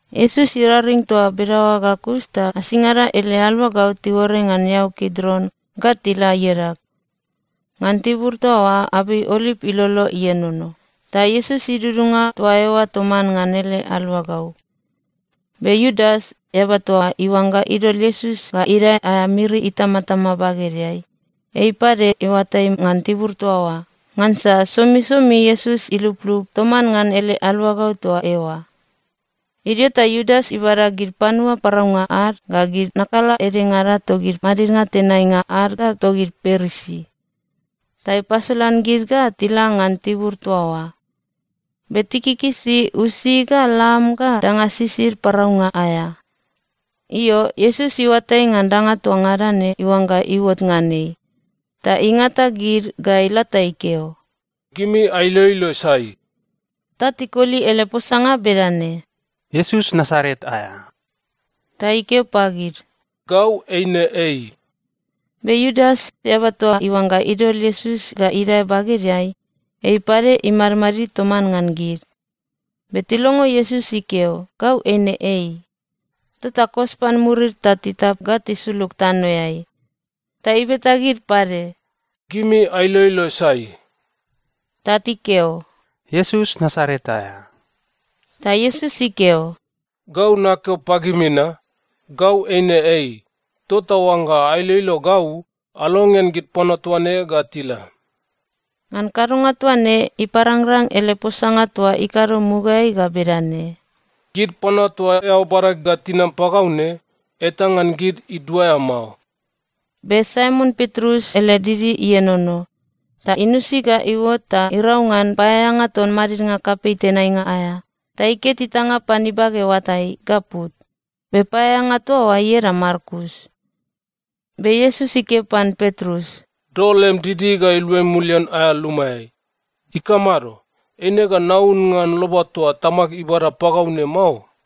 Iesus iraring toa bedaoa ga kus ta asingada ele aluagau tiuore ngan eau Kidron ga tila iadag. Ngan tibur toa oa abei oliv ilolo ienono, ta Iesus idudunga toa eoa toman ngan ele aluagau. Be Iudas, eaba toa iuangga idol Iesus ga idae aea miri itamatama bagedeai, ei pade iuatai ngan tibur toa oa, ngansa somisomi Iesus iluplup toman ngan ele aluagau toa eoa. Idio ta Iudas ibada gid panua paraunga ad ga gid nakala edengada togid madidnga tenainga ad ga togid Parisi, ta ipasolan gid ga tila ngan tibur toa oa. Be tikikisi usi ga lam ga danga sisid paraunga aea. Io, Iesus iuatai ngan danga toa ngada ne iuangga iuot ngan ei, ta ingata gid ga ila ta ikeo, “Gimi ailoilo sai?” Ta tikoli ele posanga bedane, “Iesus Nasaret aea.” Ta ikeo pagid, “Gau eine Ei.” Be Iudas, eaba toa iuangga idol Iesus ga idae bagedeai, ei pade imadmadid toman ngan gid. Be tilongo Iesus ikeo, “Gau eine Ei,” tota kos pan murid ta titap ga tisulug tanoeai. Ta ibeta gid pade, “Gimi ailoilo sai?” Ta tikeo, “Iesus Nasaret aea.” Ta Iesus ikeo, “Gau nakeo pagimi na, Gau eine Ei. Tota oangga ailoilo gau, alongean gid panua toa ne ga tila.” Ngan kadonga toaine, iparangrang ele posanga toa ikado mugaeai ga bedane, “Gid panua toa eao bada ga tinam pagau ne, eta ngan gid iduaea mao.” Be Saimon Petrus ele didi ienono. Ta inusi ga iuot ta irau ngan paeaeanga ton madidnga kapei tenainga aea, ta iket itanga pan ibage oatai ga put. Be paeaeanga toa oa ieda Malkus. Be Iesus ikeo pan Petrus, “Dol lem didi ga iluai mulian aea lumaeai. Ikamado? Eine ga naun ngan loba toa Tamag ibada pagau ne mao?”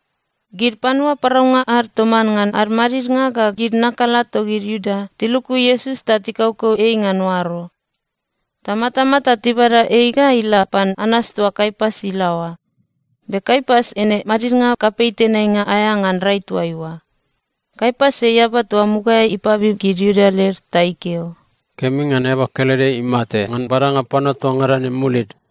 Gid panua paraunga ad toman ngan ad madidnga ga gid nakala togid Iuda tiluku Iesus ta tikaukau ei ngan oaro. Ta matamata tibada ei ga ila pan Anas toa Kaiapas ilaoa. Be Kaiapas eine madidnga kapei tenainga aea ngan rai toaiua. Kaiapas, ei eaba toa mugaeai ipabib gid Iuda led ta ikeo, “Kemi ngan eaba kelede imate ngan badanga panua toa ngada ne mulid.”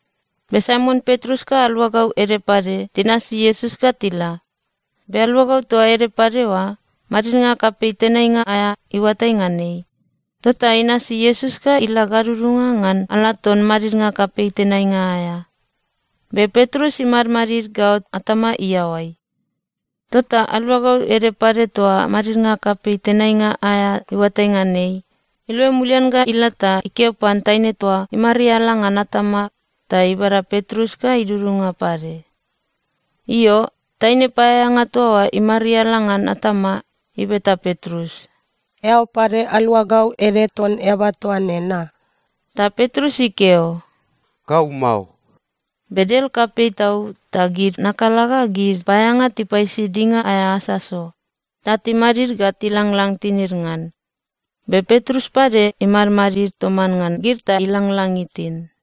Be Saimon Petrus ga aluagau ede pade tinasi Iesus ga tila. Be aluagau toa ede pade oa, madidnga kapei tenainga aea iuatai ngan ei. Tota inasi Iesus ga ila gadudunga ngan ala ton madidnga kapei tenainga aea. Be Petrus imadmadid gaot atama iaoai. Tota aluagau ede pade toa madidnga kapei tenainga aea iuatai ngan ei, iluai mulian ga ila ta ikeo pan taine toa imariala ngan atama ta ibada Petrus ga idudunga pade. Io, taine paeaeanga toa imariala ngan atama ibeta Petrus, “Eao pade aluagau ede ton eaba toa ne, na?” Ta Petrus ikeo, “Gau mao.” Be del kapei tau ta gid nakala ga gid paeaeanga tipaisi dinga aea asaso ta timadid ga tilanglang tinid ngan. Be Petrus pade imadmadid toman ngan gid ta ilanglang itin.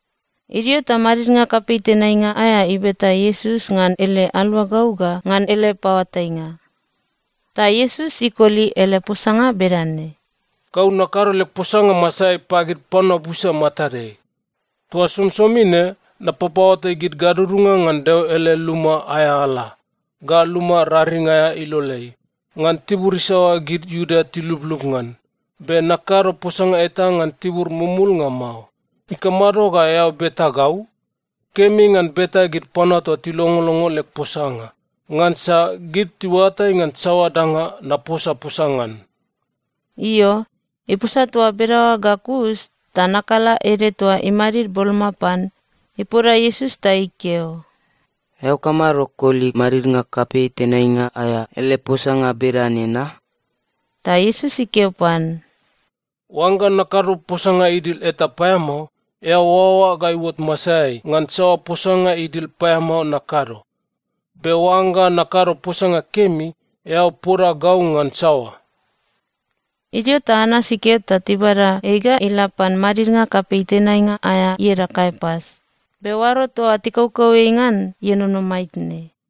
Idio ta madidnga kapei tenainga aea ibeta Iesus ngan ele aluagau ga ngan ele paoatainga. Ta Iesus ikoli ele posanga bedane, “Gau nakado leg posanga masaeai pagid panua busa matadeai. Toa somisomi ne napapaoatai gid gadudunga ngan Deo ele luma aea ala, ga luma raring aea iloleai, ngan tibur isaoa gid Iuda tiluplup ngan. Be nakado posanga eta ngan tibur mumulnga mao. Ikamado ga eao beta gau? Kemi ngan beta gid panua toa tilongolongo leg posanga. Ngansa gid tiuatai ngan saoa danga naposaposa ngan.” Io, iposa toa bedaoa ga kus ta nakala ede toa imadid boloma pan, ipoda Iesus ta ikeo, “Eao kamado koli madidnga kapei tenainga aea ele posanga bedane na?” Ta Iesus ikeo pan, “Oangga nakado posanga idil eta paeamao, eao oaoa ga iuot masaeai ngan saoa posanga idil paeamao nakado. Be oangga nakado posanga kemi, eao poda gau ngan saoa?” Idio ta Anas ikeo ta tibada ei ga ila pan madidnga kapei tenainga aea ieda Kaiapas. Be oaro toa tikaukau ei ngan ienono maitne.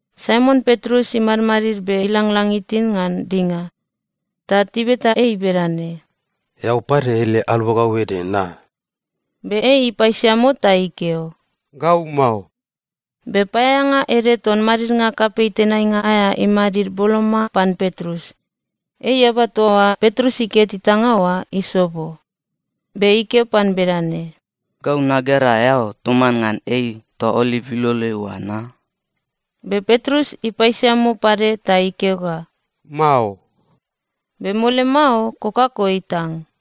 Saimon Petrus imadmadid be ilanglang itin ngan dinga. Ta tibeta ei bedane, “Eao pade ele aluagau ede, na?” Be ei ipaisiamo ta ikeo, “Gau mao.” Be paeaeanga ede ton madidnga kapei tenainga aea imadid boloma pan Petrus. Ei eaba toa Petrus iket itanga oa isobo. Be ikeo pan bedane, “Gau nagera eao toman ngan ei toa oliv iloleai oa, na?” Be Petrus ipaisiamo pade ta ikeo ga, “Mao.” Be mole mao kokako itang.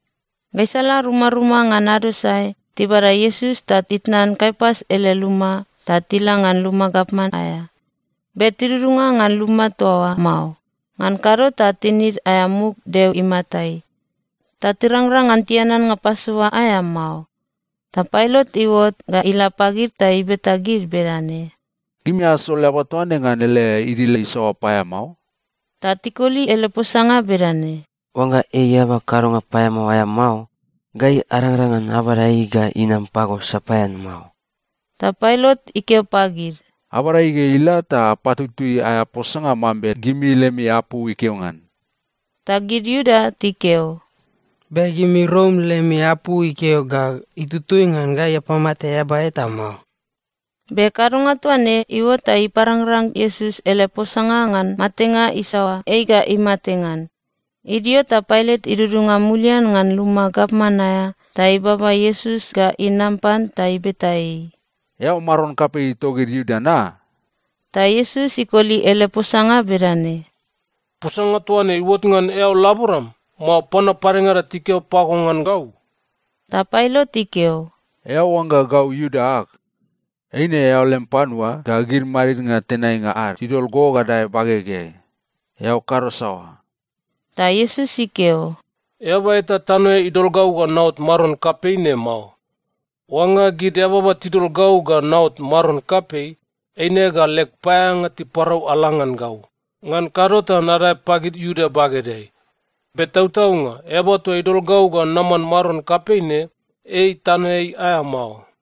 Gaisala rumaruma ngan ado sae tibada Iesus ta titnan Kaiapas ele luma ta tila ngan luma gavman aea. Be tidudunga ngan luma toa oa mao, ngan kado ta tinid aea muk Deo imatai, ta tirangrang ngan tian annga Pasova aea mao. Ta Pailat iuot ga ila pagid ta ibeta gid bedane, “Gimi asol eaba toa ne ngan ele idil isaoa paeamao?” Ta tikoli ele posanga bedane, “Oangga ei eaba kadonga paeamao aea mao, gai arangrang ngan abada ei ga inam pago sapaean mao.” Ta Pailat ikeo pagid, “Abada ei ga ila ta apatutui aea posanga mambe gimi lemi apu ikeo ngan.” Ta gid Iuda tikeo, “Be gimi Rom lemi apu ikeo ga itutui ngan gai apamate eaba eta mao.” Be kadonga toa ne iuot ta iparangrang Iesus ele posanga ngan matenga isaoa ei ga imate ngan. Idio ta Pailat idudunga mulian ngan luma gavman aea ta ibaba Iesus ga inam pan ta ibeta ei, “Eao maron kapei togid Iuda na?” Ta Iesus ikoli ele posanga bedane, “Posanga toa ne iuot ngan eao laboram, mao panua padengada tikeo pago ngan gau?” Ta Pailat ikeo, “Eao oangga gau Iuda ag? Eine eao lem panua ga gid madidnga tenainga ad tidol go ga dae bagegeai. Eao kado saoa?” Ta Iesus ikeo, “Eaba eta tanoeai idol gau ga naot maron kapei ne mao. Oangga gid eababa tidol gau ga naot maron kapei, eine ga leg paeaeanga tiparau ala ngan gau, ngan kado ta nadae pagid Iuda bagedeai. Be tautaunga Eaba toa idol gau ga naman maron kapei ne, ei tanoeai aea mao.”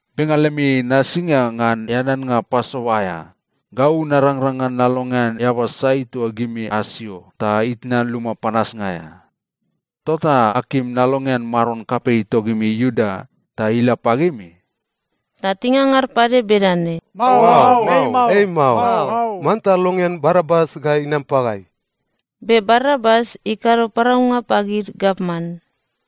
Be ngan lemi nasinga ngan eaneannga Pasova aea, gau narangrang ngan nalongean eaba sai toa gimi asio ta itnan luma panasnga aea. Tota akim nalongean maron kapei togimi Iuda ta ila pagimi?” Ta tingangar pade bedane, “Mao. Ei mao! Manta longean Barabas ga inam pagai!” Be Barabas ikado paraunga pagid gavman.